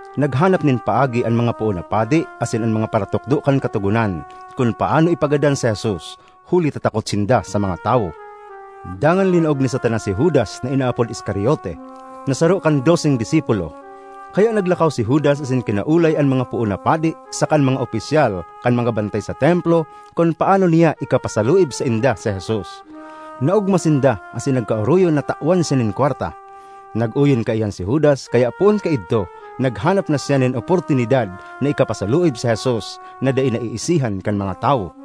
Naghanap nin paagi an mga poon na padi asin an mga paratukdo kan Katogonan kun paano ipagadan si Jesus, huli ta takot sinda sa mga tawo. Dangan linaog ni Satanas si Judas na inaapod Iscariote, na saro kan doseng disipulo. Kaya naglakaw si Judas asin kinaolay an mga poon na padi saka an mga opisyal kan mga bantay sa Templo kun paano niya ikapasaluib sainda si Jesus. Naogma sinda asin nagkaoroyon na tawan siya nin kwarta. Nag-oyon kaiyan si Judas, kaya poon kaidto naghanap na siya nin oportunidad na ikapasaluib si Jesus na dai naiisihan kan mga tawo.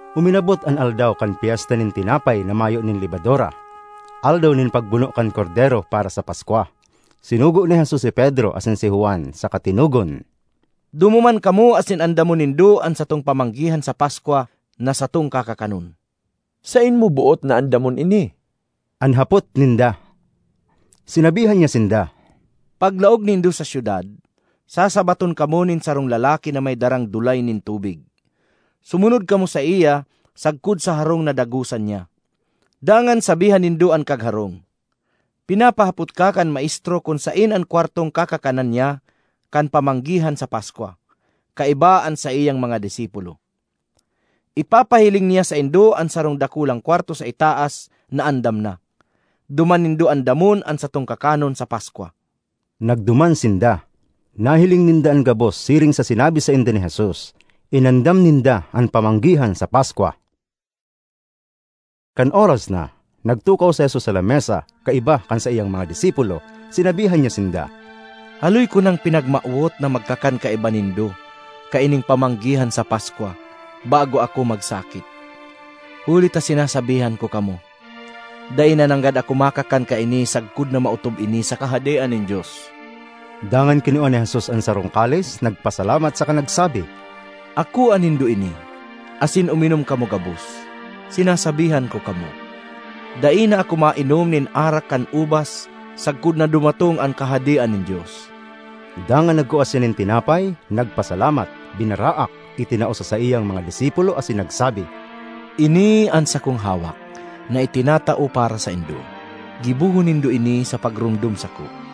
Uminabot an aldaw kan Pyesta nin Tinapay na Mayo nin Lebadura, aldaw nin pagbuno kan kordero para sa Paskwa. Sinugo ni Jesus si Pedro asin si Juan saka tinugon, “Dumuman kamo asin andamon nindo an satong pamanggihan sa Paskwa na satong kakakanon.” ”Saen mo boot na andamon ini?” an hapot ninda. Sinabihan niya sinda, “Paglaog nindo sa syudad, sasabaton kamo nin sarong lalaki na may darang dulay nin tubig. Sumunod kamo saiya sagkod sa harong na dagosan niya. Dangan sabihan nindo an kagharong, ‘Pinapahapot ka kan Maestro kun saen an kwartong kakakanan niya kan pamanggihan sa Paskwa kaiba an saiyang mga disipulo.’ Ipapahiling niya saindo an sarong dakulang kwarto sa itaas na andam na. Duman nindo andamon an satong kakanon sa Paskwa.” Nagduman sinda; nahiling ninda an gabos siring sa sinabi sainda ni Jesus. Inandam ninda an pamanggihan sa Paskwa. Kan oras na, nagtukaw si Jesus sa lamesa kaiba kan saiyang mga disipulo. Sinabihan niya sinda, “Haloy ko nang pinagmawot na magkakan kaiba nindo kaining pamanggihan sa Paskwa bago ako magsakit! Huli ta sinasabihan ko kamo, dai na nanggad ako makakan kaini sagkod na maotob ini sa Kahadean nin Dios.” Dangan kinua ni Jesus an sarong kalis, nagpasalamat saka nagsabi, “Akoa nindo ini, asin uminom kamo gabos. Sinasabihan ko kamo, dai na ako mainom nin arak kan ubas sagkod na dumatong an Kahadean nin Dios.” Dangan nagkua siya nin tinapay, nagpasalamat, binaraak, itinao sa saiyang mga disipulo asin nagsabi, “Ini an sakong hawak, na itinatao para saindo. Gibohon nindo ini sa pagromdom sako.”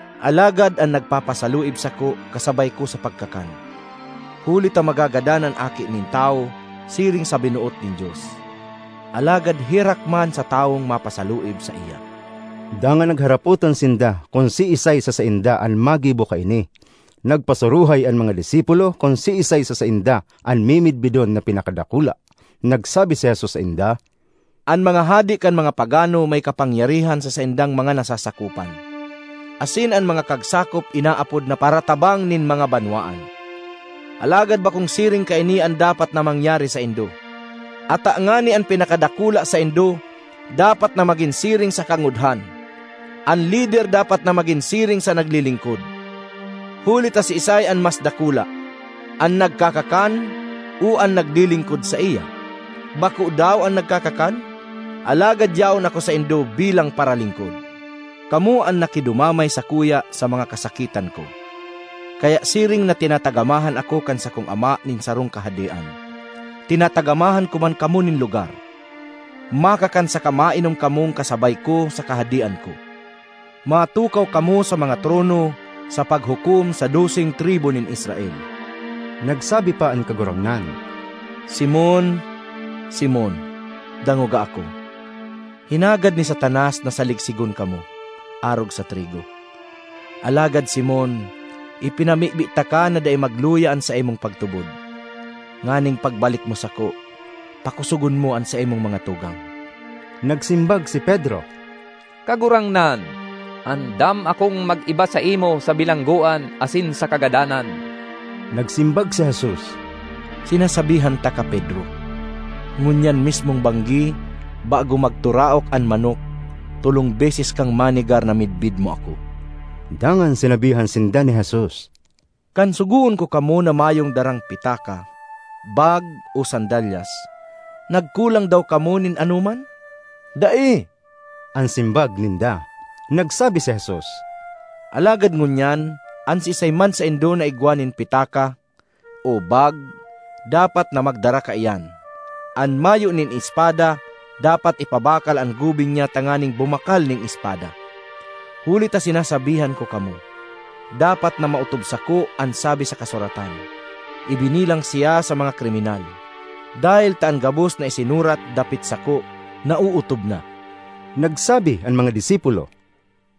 ”Alagad an nagpapasaluib sako kasabay ko sa pagkakan! Huli ta magagadan an Aki nin Tawo siring sa binoot nin Dios; alagad herak man sa tawong mapasaluib saiya!” Dangan nagharapotan sinda kun siisay sa sainda an magibo kaini. Nagpasuruhay an mga disipulo kun siisay sa sainda an mimidbidon na pinakadakula. Nagsabi si Jesus sainda, “An mga hade kan mga pagano may kapangyarihan sa saindang mga nasasakopan; asin an mga kagsakop inaapod na ‘Paratabang nin mga Banwaan!’ Alagad bakong siring kaini an dapat na mangyari saindo; ata ngani an pinakadakula saindo dapat na magin siring sa kangudhan; an lider dapat na magin siring sa naglilingkod. Huli ta siisay an mas dakula, an nagkakakan o an naglilingkod saiya? Bako daw an nagkakakan? Alagad yaon ako saindo bilang paralingkod. ”Kamo an nakidumamay sakuya sa mga kasakitan ko. Kaya siring na tinatagamahan ako kan sakong Ama nin sarong Kahadean, tinatagamahan ko man kamo nin lugar; makakan saka mainom kamong kasabay ko sa Kahadean ko. Matukaw kamo sa mga trono sa paghukom sa doseng tribu nin Israel.” Nagsabi pa an Kagurangnan, “Simon, Simon! Dangoga ako! Hinagad ni Satanas na saligsigon kamo, arog sa trigo. Alagad, Simon, ipinamibi taka na dai magluya an saimong pagtubod, nganing pagbalik mo sako, pakosogon mo an saimong mga tugang.” Nagsimbag si Pedro, “Kagurangnan, andam akong mag-iba saimo sa bilanggoan asin sa kagadanan!” Nagsimbag si Jesus, “Sinasabihan taka, Pedro, ngunyan mismong banggi, bago magturaok an manok, tolong beses kang manegar na midbid mo ako.” Dangan sinabihan sinda ni Jesus, “Kan sugoon ko kamo na mayong darang pitaka, bag, o sandalyas, nagkulang daw kamo nin anoman?” “Dai,” an simbag ninda. Nagsabi si Jesus, “Alagad ngunyan, an siisay man saindo na igwa nin pitaka o bag dapat na magdara kaiyan; an mayo nin espada dapat ipabakal an gubing niya tanganing bumakal nin espada. Huli ta sinasabihan ko kamo: dapat na maotob sako an sabi sa kasuratan, ‘Ibinilang siya sa mga kriminal.’ Dahel ta an gabos na isinurat dapit sako naootob na.” Nagsabi an mga disipulo,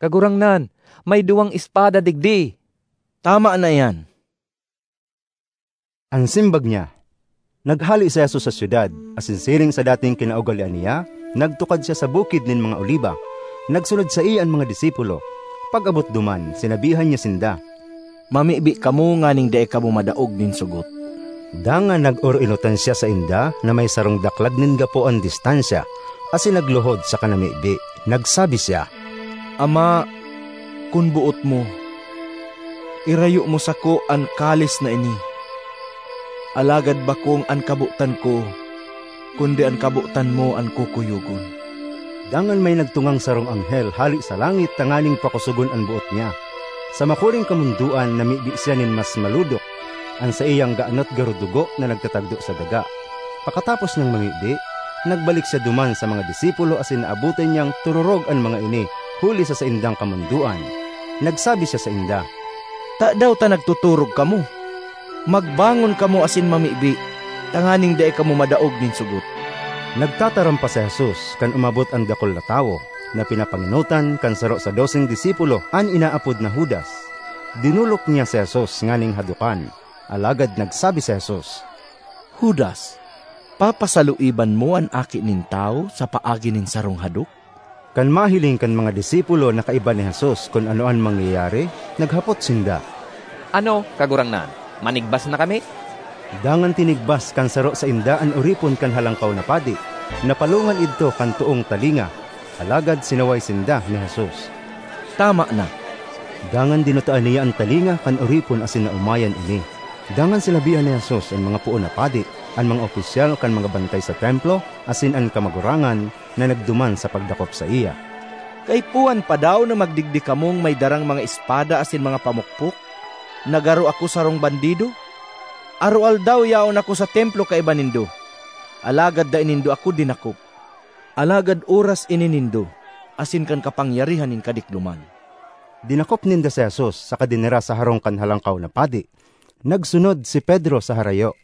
“Kagurangnan, may duwang espada digdi!” “Tama na iyan!” an simbag niya. Naghale si Jesus sa syudad asin siring sa dating kinaugalean niya, nagtukad siya sa Bukid nin mga Oliba. Nagsunod saiya an mga disipulo. Pag-abot duman, sinabihan niya sinda, “Mamibi kamo nganing dai kamo madaog nin sogot.” Dangan nag-oroenotan siya sainda na may sarong daklag nin gapo an distansya, asin nagluhod saka namibi. Nagsabi siya, “Ama, kun boot mo, irayo mo sako an kalis na ini. Alagad bakong an kabotan ko kundi an kabotan mo an kukuyogon.” Dangan may nagtungang sarong anghel hale sa langit tanganing pakosogon an boot niya. Sa makuring kamondoan namibi siya nin mas malodok; an saiyang ganot garo dugo na nagtatagdo sa daga. Pakatapos niyang mamibi, nagbalik siya duman sa mga disipulo asin naabotan niyang tororog an mga ini huli sa saindang kamondoan. Nagsabi siya sainda, “Tadaw ta nagtotorog kamo? Magbangon kamo asin mamibi tanganing dai kamo madaog nin sogot.” Nagtataram pa si Jesus kan umabot an dakul na tawo, na pinapangenotan kan saro sa doseng disipulo, an inaapod na Judas. Dinolok niya si Jesus nganing hadokan. Alagad nagsabi si Jesus, “Judas, papasaluiban mo an Aki nin Tawo sa paagi nin sarong hadok?” Kan mahiling kan mga disipulo na kaiba ni Jesus kun ano an mangyayari, naghapot sinda, “Ano, Kagurangnan, manigbas na kami?” Dangan tinigbas kan saro sainda an oripon kan Halangkaw na Padi; napalongan idto kan toong talinga. Alagad sinaway sinda ni Jesus, “Tama na!” Dangan dinutaan niya an talinga kan oripon asin naomayan ini. Dangan sinabihan ni Jesus an mga poon na padi, an mga opisyal kan mga bantay sa Templo asin an kamagurangan na nagduman sa pagdakop saiya, “Kaipuhan pa daw na magdigdi kamong may darang mga espada asin mga pamukpok na garo ako sarong bandido? Aroaldaw yaon ako sa Templo kaiba nindo, alagad dai nindo ako dinakop. Alagad oras ini nindo asin kan kapangyarihan nin kadikloman.” Dinakop ninda si Jesus saka dinara sa harong kan Halangkaw na Padi; nagsunod si Pedro sa harayo.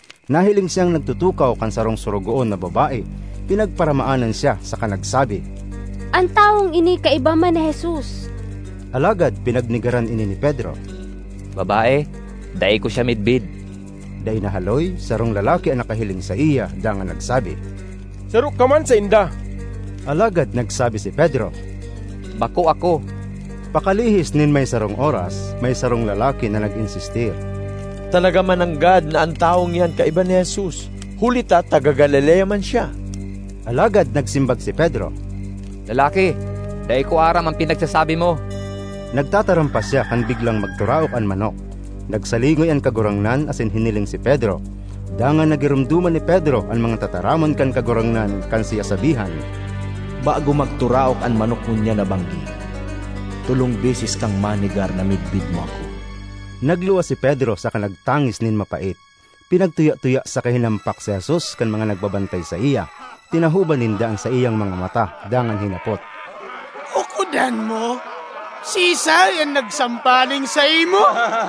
Nahiling siyang nagtutukaw kan sarong sorogoon na babae; pinagparamaanan siya saka nagsabi, “An tawong ini kaiba man ni Jesus!” Alagad pinagnegaran ini ni Pedro, “Babae, dai ko siya midbid!” Dai nahaloy, sarong lalaki an nakahiling saiya dangan nagsabi, “Saro ka man sainda!” Alagad nagsabi si Pedro, “Bako ako!” Pakalihis nin may sarong oras, may sarong lalaki na nag-insistir, “Talaga mananggad na an tawong iyan kaiba ni Jesus, huli ta taga Galilea man siya!” Alagad nagsimbag si Pedro, “Lalaki, dai ko aram an pinagsasabi mo!” Nagtataram pa siya kan biglang magturaok an manok. Nagsalingoy an Kagurangnan asin hiniling si Pedro. Dangan nagiromdoman ni Pedro an mga tataramon kan Kagurangnan kan siya sabihan, “Bago magturaok an manok ngunyan na banggi, tolong beses kang manegar na midbid mo ako.” Nagluwas si Pedro saka nagtangis nin mapait. Pinagtuya-tuya saka hinampak si Jesus kan mga nagbabantay saiya. Tinahoban ninda an saiyang mga mata dangan hinapot, “Ukodan mo, siisay an nagsampaling saimo?”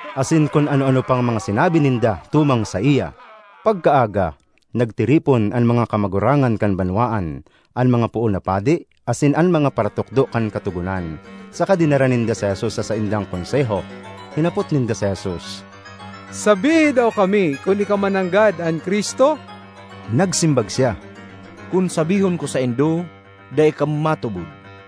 Asin kun ano-ano pang mga sinabi ninda tumang saiya. Pagkaaga, nagtiripon an mga kamagurangan kan banwaan, an mga poon na padi, asin an mga paratukdo kan Katogonan, saka dinara ninda si Jesus sa saindang Konseho. Hinapot ninda si Jesus, “Sabihi daw kami kun ika mananggad an Cristo?” Nagsimbag siya, “Kun sabihon ko saindo, dai kamo matubod;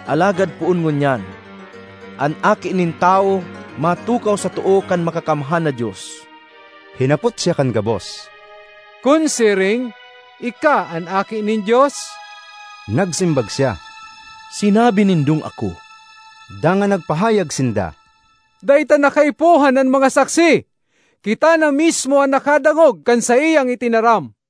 Alagad poon ngunyan, an Aki nin Tawo matukaw sa too kan Makakamhan na Dios.” Hinapot siya kan gabos, “Kun siring, ika an Aki nin Dios?” Nagsimbag siya, “Sinabi nindong ako.” Dangan nagpahayag sinda, “Dai ta na kaipuhan an mga saksi. Kita na mismo an nakadangog kan saiyang itinaram!”